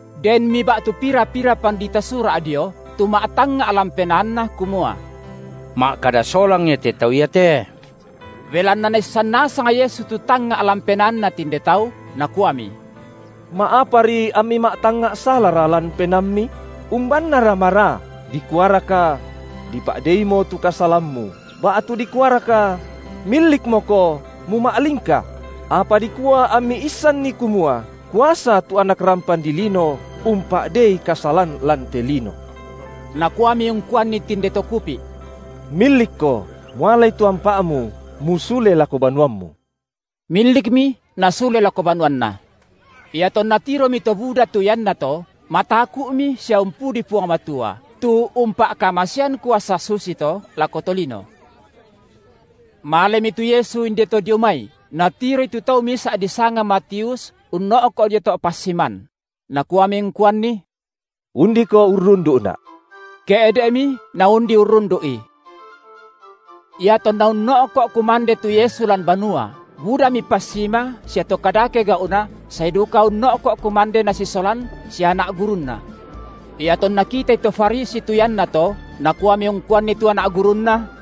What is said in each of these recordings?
Denmi ba’tu pira-pira pandita Sura’ dio, tu ma’tangnga’ lan penaanna kumua: Ma’kada solang Ia te Tau iate. Belanna Naissan nasang Yesu tu tangnga’ lan penaanna tinde tau, Nakuami: Ma’apari ammi ma’tangnga’ salara lan penaammi? Umbannara maraa, dikuaraka: Dipa’deimo tu kasalammu, ba’tu dikuaraka: Millikmoko, muma’lingka? Apa dikua ammi issanni kumua kuasa tu Anak rampan dilino umpa’dei kasalan lan te lino –, Nakuami ungkuanni tinde to kupi’: Millikko, mualai tu ampa’mu, musule lako banuammu. Millikmi nasule lako banuanna. Iatonna tiromi to buda tu iannato, mataku’mi sia umpudi Puang Matua, tu umpa’kamasean kuasa susito lako to lino. Malemi tu Yesu inde to dio mai, Natiroi tu tau misa’ disanga Matius unno’ko’ dio to’ passiman; Nakuami ungkuanni: undiko urrundu’Na’. Ke’de’mi naundi urrundu’I. Iatonna unno’ko’ kumande tu Yesu lan banua, budami passima sia to kadake gau’na sae duka unno’ko’ kumande Nasisolan sia anak gurunNa. Iatonna kitai to Farisi tu iannato nakuami ungkuanni tu anak gurunNa: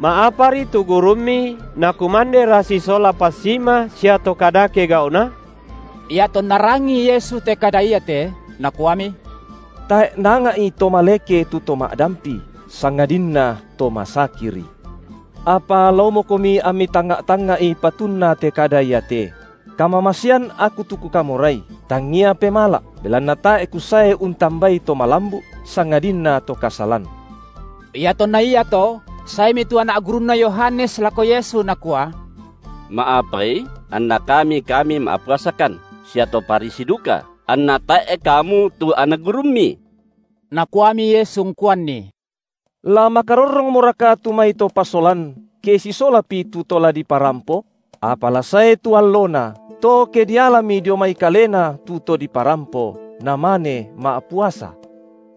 Ma’apari tu gurummi Nakumandera sisola passima sia to kadake gau’na? Iatonna rangii Yesu te kada iate, Nakuami: Tae’ naanga’i to maleke tu to ma’dampi, sangadinna to masakiri. Apa laomokomi ammi tangnga’-tangnga’i patunna te kada iate: Kamamasean Aku tu Kukamorai, tangia pemala’, belanna tae’ Kusae untambai to malambu’, sangadinna to kasalan. Iatonna iato saemi tu anak gurunna Yohanes lako Yesu nakua: Ma’apai anna kami kami ma’puasakan sia to Farisi duka, anna tae’ kamu tu anak gurumMi? Nakuami Yesu ungkuanni: La makarorrongmoraka tu mai to pasolan ke sisolapi tu to la diparampo? Apa la sae tu allona, to ke dialami dio mai kalena tu to diparampo, namane ma’puasa.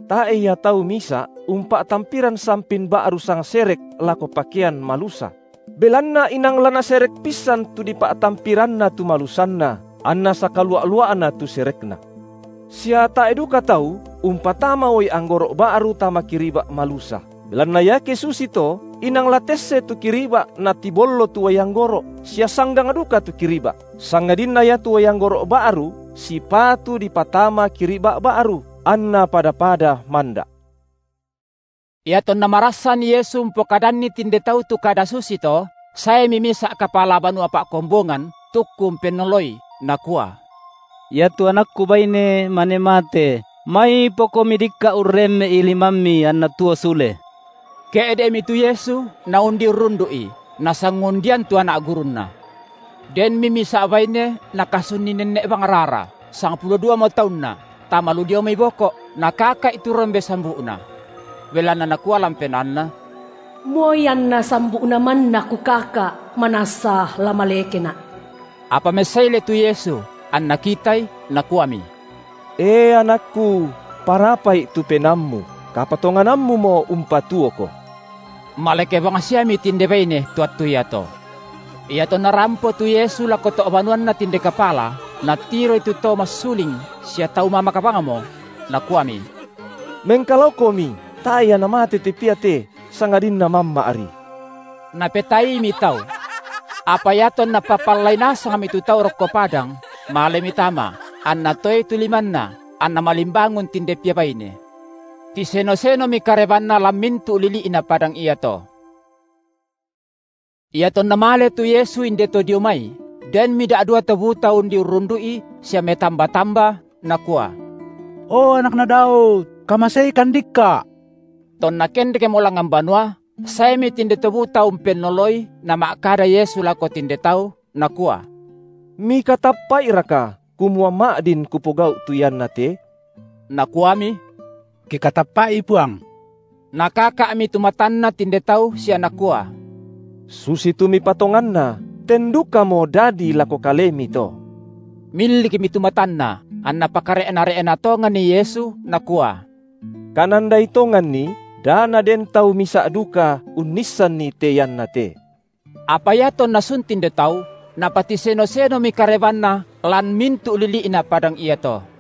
Tae’ ia tau misa’ umpa’tampiran sampin ba’ru sangserek lako pakean malusa; belanna inang la naserek pissan dipa’tampiranna tu malusanna, anna sakalua’-lua’na tu serekna. Sia tae’ duka tau umpatama uai anggoro’ ba’ru tama kiriba’ malusa. Belanna iake susito inang la tesse tu kiriba’ natibollo tu uai anggoro’ sia sanggang duka tu kiriba’, sangadinna iatu uai anggoro’ ba’ru sipatu dipatama kiriba’ ba’ru, anna pada-pada manda’. Iatonna marassan Yesu umpokadanni tinde tau tu kada susito, saemi misa’ kapala banua pa’kombongan, tukku umpennoloI, nakua: Iatu anakku baine, mane mate, maipoKomi dikka’ urremme’i limamMi anna tuo sule. Ke’de’mi tu Yesu Naundi urrundu’i, nasangundian tu anak gurunNa. Denmi misa’ baine nakasunni nenne’ bang rara, sangpulo duamo taunna, tama lu dio mai boko’, nakaka’i tu rombe sambu’na. Belanna nakua lan penaanna: Moi anna sambu’Na manna kukaka’, manassa la malekena’. Apa messaile tu Yesus, anNa kitai, Nakuami: E anakKu, parapa’i tu penaammu, kapatonganammumo umpatuoko. Maleke bangsiami tinde baine to attu iato. Iatonna rampo tu Yesu lako to’ banuanna tinde kapala, Natiroi tu to massuling sia tau mamak bangmo. Nakuami: Mengkalaokomi, tae’ ia namate te pia te, sangadinna mamma’ri. Napetaaimi tau. Apa iatonna papallai nasangmi tu tau rokko padang, malemi tama, anNa toei tu limanna, anna malimbangun tinde pia baine. Tiseno-senomi karebanNa lan mintu’ lili’na padang iato. Iatonna male tu Yesu inde to dio mai, denmi da’dua to buta undi urrundu’I sia metamba-tamba, nakua: O Anakna Daud, kamaseikan dikka’. Tonna kendekmo langngan banua, saemi tinde to buta umpennoloI Nama’kada Yesu lako tinde tau, Nakua: Mikatappa’iraka, kumua ma’din Kupogau’ tu ianna te? Nakuami: Kikatappa’i, Puang! Nakaka’mi tu matanna tinde tau sia Nakua: Susitu mipatonganna ten dukamo dadi lako kalemi to. Millikmi tu matanna, anNa pakare’na-re’na tonganni Yesu, Nakua: Kanandai tonganni, da naden tau misa’ duka unnissanni te ianna te. Apa iatonna sun tinde tau, napatiseno-senomi karebanNa lan mintu’ lili’na padang iato.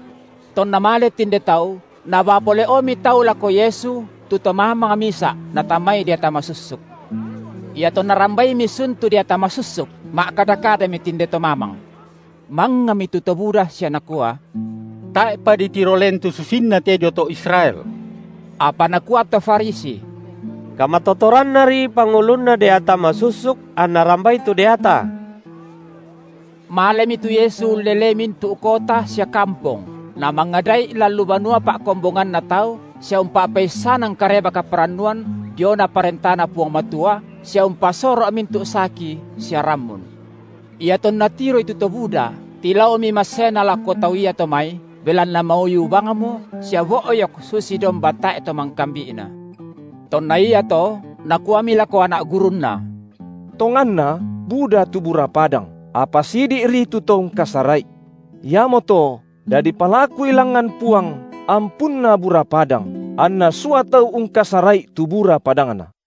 Tonna male tinde tau nabaa pole’omi tau lako Yesu tu to mamang misa’ natamai deata masussuk. Iatonna rambaimi sun tu deata masussuk, ma’kada-kadami tinde to mamang. Mangngami tu to buda sia nakua: Tae’pa ditiro len tu susinna te dio to Israel. Apa nakua tu to Farisi: Kamatotorannari pangulunna deata masussuk anNa rambai tu deata. Malemi tu Yesu ullelei mintu’ kota sia kampong, Namangada’i lan lu banua pa’kombonganna tau sia umpa’peissanan Kareba kaparannuan diona parentanNa Puang Matua sia umpasoro’ mintu’ saki sia rammun. Iatonna tiroi tu to buda, tilaomi masseNa lako tau iato mai, belanna mauyu bangmo sia bo’yok susi domba tae’ to mangkambi’na. Tonna iato Nakuami lako anak gurunNa: Tonganna buda tu bura padang, apa sidi’ri tu to ungkasara’i. Iamoto, dadi palakui langngan Puang ampunna bura padang anNa sua tau ungkasara’i tu bura padangNa.